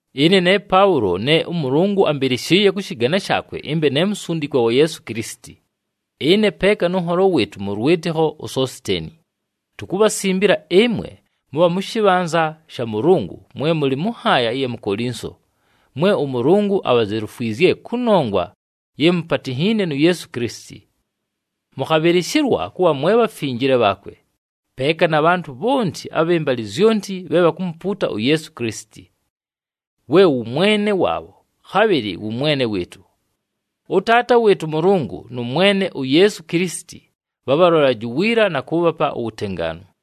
Ɨne ne Paʉlo, ne ʉMʉlʉngʉ ambɨlɨshɨɨye kʉ shɨgane shaakwe ɨmbe ne musundikwa wa Yeesu Kilisiti. Ɨne peeka nʉ nholo wɨɨtʉ mʉ lwɨtɨkho uSositeeni, tukubhasimbila ɨmwe mʉbha mʉ shɨbhanza sha Mʉlʉngʉ, mwe mʉlɨ mʉ nhaaya ɨya mu Kolinso, mwe ʉMʉlʉngʉ abhazelufwizye kʉnongwa ye mupatinhiine nu Yeesu Kilisiti. Mʉkhabhɨlɨshɨlwa kʉbha mwe bhafinjile bhaakwe, peeka na bhantʉ bhonti abhɨ mbalɨ zyonti bhe bhakumupuuta uYeesu Kilisiti, we wʉ Mwene waabho, khabhɨlɨ wʉ Mwene wɨɨtʉ. ɄTaata wɨɨtʉ ʉMʉlʉngʉ nʉ Mwene uYeesu Kilisiti bhabhalolelaje uwiila, na kʉʉbhapa uwutengaanu.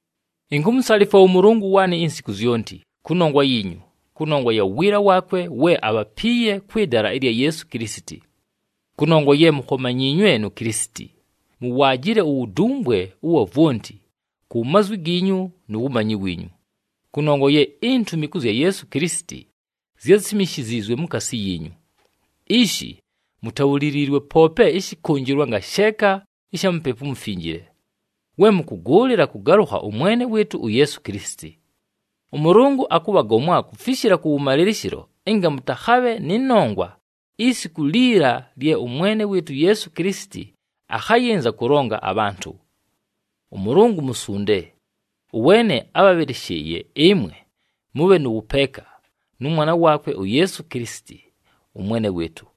Inkumusalifwa ʉMʉlʉngʉ waanɨ insiku zyonti kʉnongwa yiinyu, kʉnongwa ya wiila waakwe we abhapiiye kwɨ dala ɨlya Yeesu Kilisiti. Kʉnongwa ye mukhomanyiinywe nu Kilisiti, muwaajile uwudumbwe ʉwa vwonti, ku mazwi giinyu nu wumanyi wiinyu. Kʉnongwa ye intumi kʉ zya Yeesu Kilisiti zyásimishiziizwe mukaasi yiinyu. Ishi mutabhuliliilwe poope ɨshɨkʉnjɨlwa ngasheeka ɨsha Mupepu uMufinjile, we mʉkʉgʉʉlɨla kʉgalʉkha ʉMwene wɨɨtʉ uYeesu Kilisiti. ɄMʉlʉngʉ akʉbhagomwa kufishila kʉwʉmalɨlɨshɨlo ɨnga mʉtakhabhe nɨ nongwa isiku liila lye ʉMwene wɨɨtʉ uYeesu Kilisiti akhayɨnza kʉlonga abhantʉ. ɄMʉlʉngʉ musunde, ʉweene ábhabhɨlɨshɨɨye ɨmwe mʉbhe nʉ wʉpeeka nʉ Mwana waakwe uYeesu Kilisiti, ʉMwene wɨɨtʉ.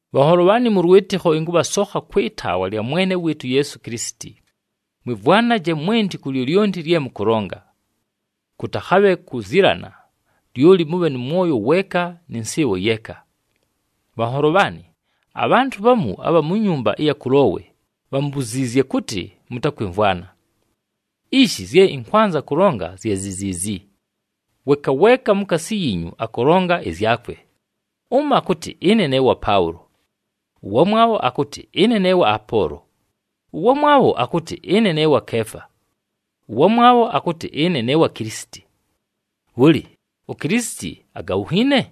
Bhanholo bhaanɨ mʉ lwɨtɨkho, ɨnkʉbhasokha kwɨ taawa lya Mwene wɨɨtʉ uYeesu Kilisiti, mwɨmvwanaje mwenti ku lyolyonti lye mʉkʉlonga. Kʉtakhabhe kuzilana, lyoli mʉbhe nʉ mwoyo weeka nɨ nsɨɨbho yeeka. Bhanholo bhaanɨ, abhantʉ bhamu abha mu nyumba ɨya Kulowe bhambuziizye kʉtɨ mʉtakwɨmvwana. Ishi, zye ɨnkwanza kʉlonga zye zi ziizi: weeka weeka mukaasi yiinyu akʉlonga ɨzyakwe, ʉmo akʉtɨ, “Ɨne ne wa Paʉlo.” Ʉwamwabho akʉtɨ, “Ɨne ne wa Apoolo.” Ʉwamwabho akʉtɨ, “Ɨne ne wa Keefa.” Ʉwamwabho akʉtɨ, “Ɨne ne wa Kilisiti.” Bhʉlɨ! UKilisiti agabhunhiine?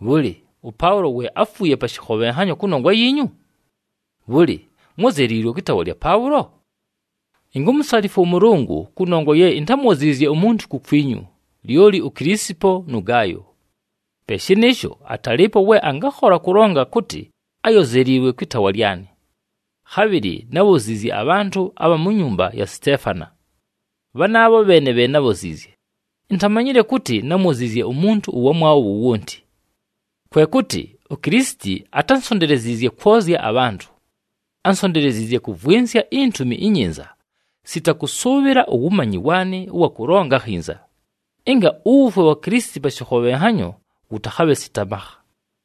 Bhʉlɨ, ʉPaʉlo we áfuuye pa shɨkhobhenhanyo kʉnongwa yiinyu? Bhʉlɨ, mwózeliilwe kwɨ taawa lya Paʉlo? Inkumusalifwa ʉMʉlʉngʉ, kʉnongwa ye intámwoziizye umuntu kukwinyu, lyoli uKilisipo nʉ Gaayo. Pe shɨnɨɨsho, atalɨɨpo we angakhola kʉlonga kʉtɨ áyozeliiwe kwɨ taawa lyanɨ. Khabhɨlɨ nábhoziizye abhantʉ abha mu nyumba ya Siteefana. Bhanaabho bheene bhe nábhoziizye, intamanyile kʉtɨ námwoziizye umuntu ʉwamwabho wowonti. Kwe kʉtɨ, uKilisiti atánsonteleziizye kwozya abhantʉ. Ánsonteleziizye kʉvwɨnsya iNtumi iNyinza, sita kʉsʉʉbhɨla uwumanyi waanɨ ʉwa kʉlonga akhinza, ɨnga uwufwe wa Kilisiti pa shɨkhobhenhanyo wʉtakhabhe sita makha.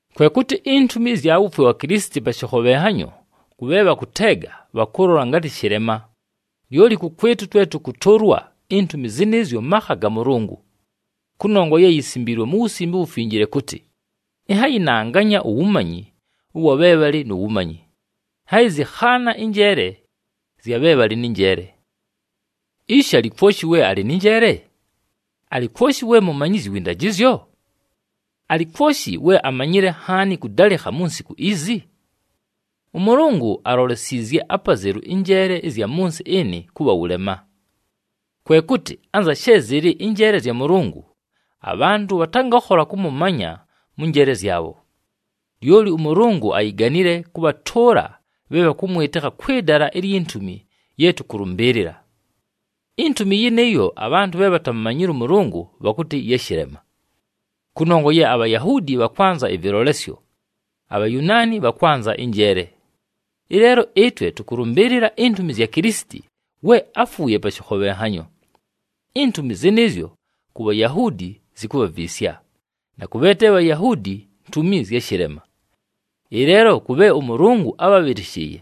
Kwe kʉtɨ intumi ɨzya wufwe wa Kilisiti pa shɨkhobhenhanyo kʉ bhe bhakʉteega bhakʉlola ngatɨ shɨlema, lyoli kʉkwɨtʉ twe tʉkʉtʉʉlwa, intumi zɨnɨɨzyo makha ga Mʉlʉngʉ. Kʉnongwa ye yisimbiilwe mu Wusimbe uWufinjile kʉtɨ, “Ɨnhayɨnanganya uwumanyi ʉwa bhe bhalɨ nu wumanyi. Ɨnhayɨzɨkhaana ɨnjeele zya bhe bhalɨ nɨ njeele.” Ishi, alɨ kwoshi we alɨ nɨ njeele? Alɨ kwoshi we mumanyizyi wɨ ndajɨzyo? Alɨ kwoshi we amanyile nhaani kʉdalɨkha mu nsiku izi? ɄMʉlʉngʉ alolesiizye apazelu ɨnjeele ɨzya mʉ nsɨ ɨnɨ kʉbha wʉlema. Kwe kʉtɨ anza she zɨlɨ ɨnjeele zya Mʉlʉngʉ, abhantʉ bhatangakhola kʉmʉmanya mʉ njeele zyabho. Lyoli ʉMʉlʉngʉ ayiganile kʉbhatʉʉla bhe bhakʉmwɨtɨkha kwɨ dala ilyi ntumi ye tʉkʉlʉmbɨɨlɨla. Intumi yɨnɨɨyo abhantʉ bhe bhatamumanyile ʉMʉlʉngʉ bhakʉtɨ ya shɨlema. Kʉnongwa ye aBhayahuudi bhakwanza ɨvɨlolesyo, aBhayunaani bhakwanza ɨnjeele. Ɨleelo ɨtwe, tʉkʉlʉmbɨɨlɨla intumi zya Kilisiti we áfuuye pa shɨkhobhenhanyo. Intumi zɨnɨɨzyo ku Bhayahuudi zikubhaviisya, na kʉ bhe te Bhayahuudi ntumi zya shɨlema. Ɨleelo kʉ bhe ʉMʉlʉngʉ ábhabhɨlɨshɨɨye,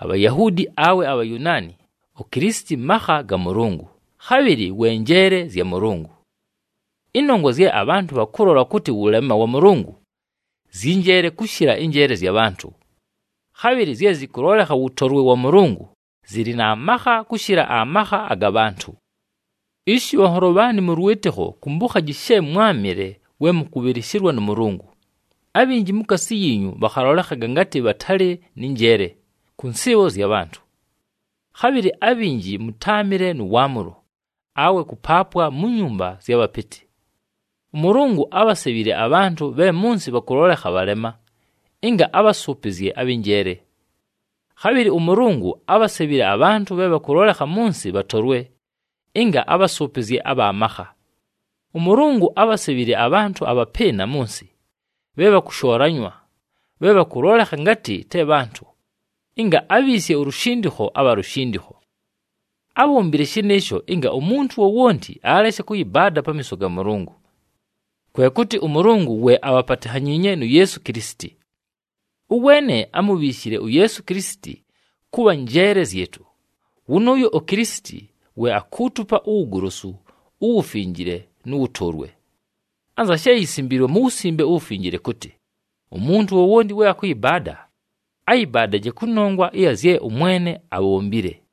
aBhayahuudi awe aBhayunaani, uKilisiti makha ga Mʉlʉngʉ, khabhɨlɨ we njeele zya Mʉlʉngʉ. Ɨnongwa zye abhantʉ bhakʉlola kʉtɨ wʉlema wa Mʉlʉngʉ, zyɨ njeele kʉshɨla ɨnjeele zya bhantʉ. Khabhɨlɨ zye zɨkʉlolekha wʉtolwe wa Mʉlʉngʉ, zɨlɨ na makha kʉshɨla amakha aga bhantʉ. Ishi bhanholo bhaanɨ mʉ lwɨtɨkho, kumbukhaji she mwámɨle we mʉkʉbhɨlɨshɨlwa nʉ Mʉlʉngʉ. Abhinji mukaasi yiinyu bhakhalolekhaga ngatɨ bhatalɨ nɨ njeele kʉ nsɨɨbho zya bhantʉ. Khabhɨlɨ abhinji mʉtáamɨle nʉ waamʉlo, awe kʉpaapwa mu nyumba ɨzya bhapɨtɨ. ɄMʉlʉngʉ ábhasebhile abhantʉ bhe mʉ nsɨ bhakʉlolekha bhalema, ɨnga abhasʉʉpɨzye abhɨ njeele. Khabhɨlɨ ʉMʉlʉngʉ ábhasebhile abhantʉ bhe bhakʉlolekha mʉ nsɨ bhatolwe, ɨnga abhasʉʉpɨzye abha makha. ɄMʉlʉngʉ ábhasebhile abhantʉ abhapɨɨna mʉ nsɨ, bhe bhakʉshoolanywa, bhe bhakʉlolekha ngatɨ te bhantʉ, ɨnga abhiisye ulushindikho abha lushindikho. Ábhombile shɨnɨɨsho ɨnga umuntu wowonti aleshe kʉyɨbaada pamiiso ga Mʉlʉngʉ. Kwe kʉtɨ ʉMʉlʉngʉ we abhapatinhanyiinye nu Yeesu Kilisiti. Ʉweene amubhiishile uYeesu Kilisiti kʉbha njeele zyɨtʉ, wʉnʉʉyo uKilisiti we akuutupa uwugolosu, uwufinjile, nʉ wʉtʉʉlwe. Anza she yisimbiilwe mu Wusimbe uWufinjile kʉtɨ, “Umuntu wowonti we akʉyɨbaada, ayɨbaadaje kʉnongwa ɨya zye ʉMwene abhombile.”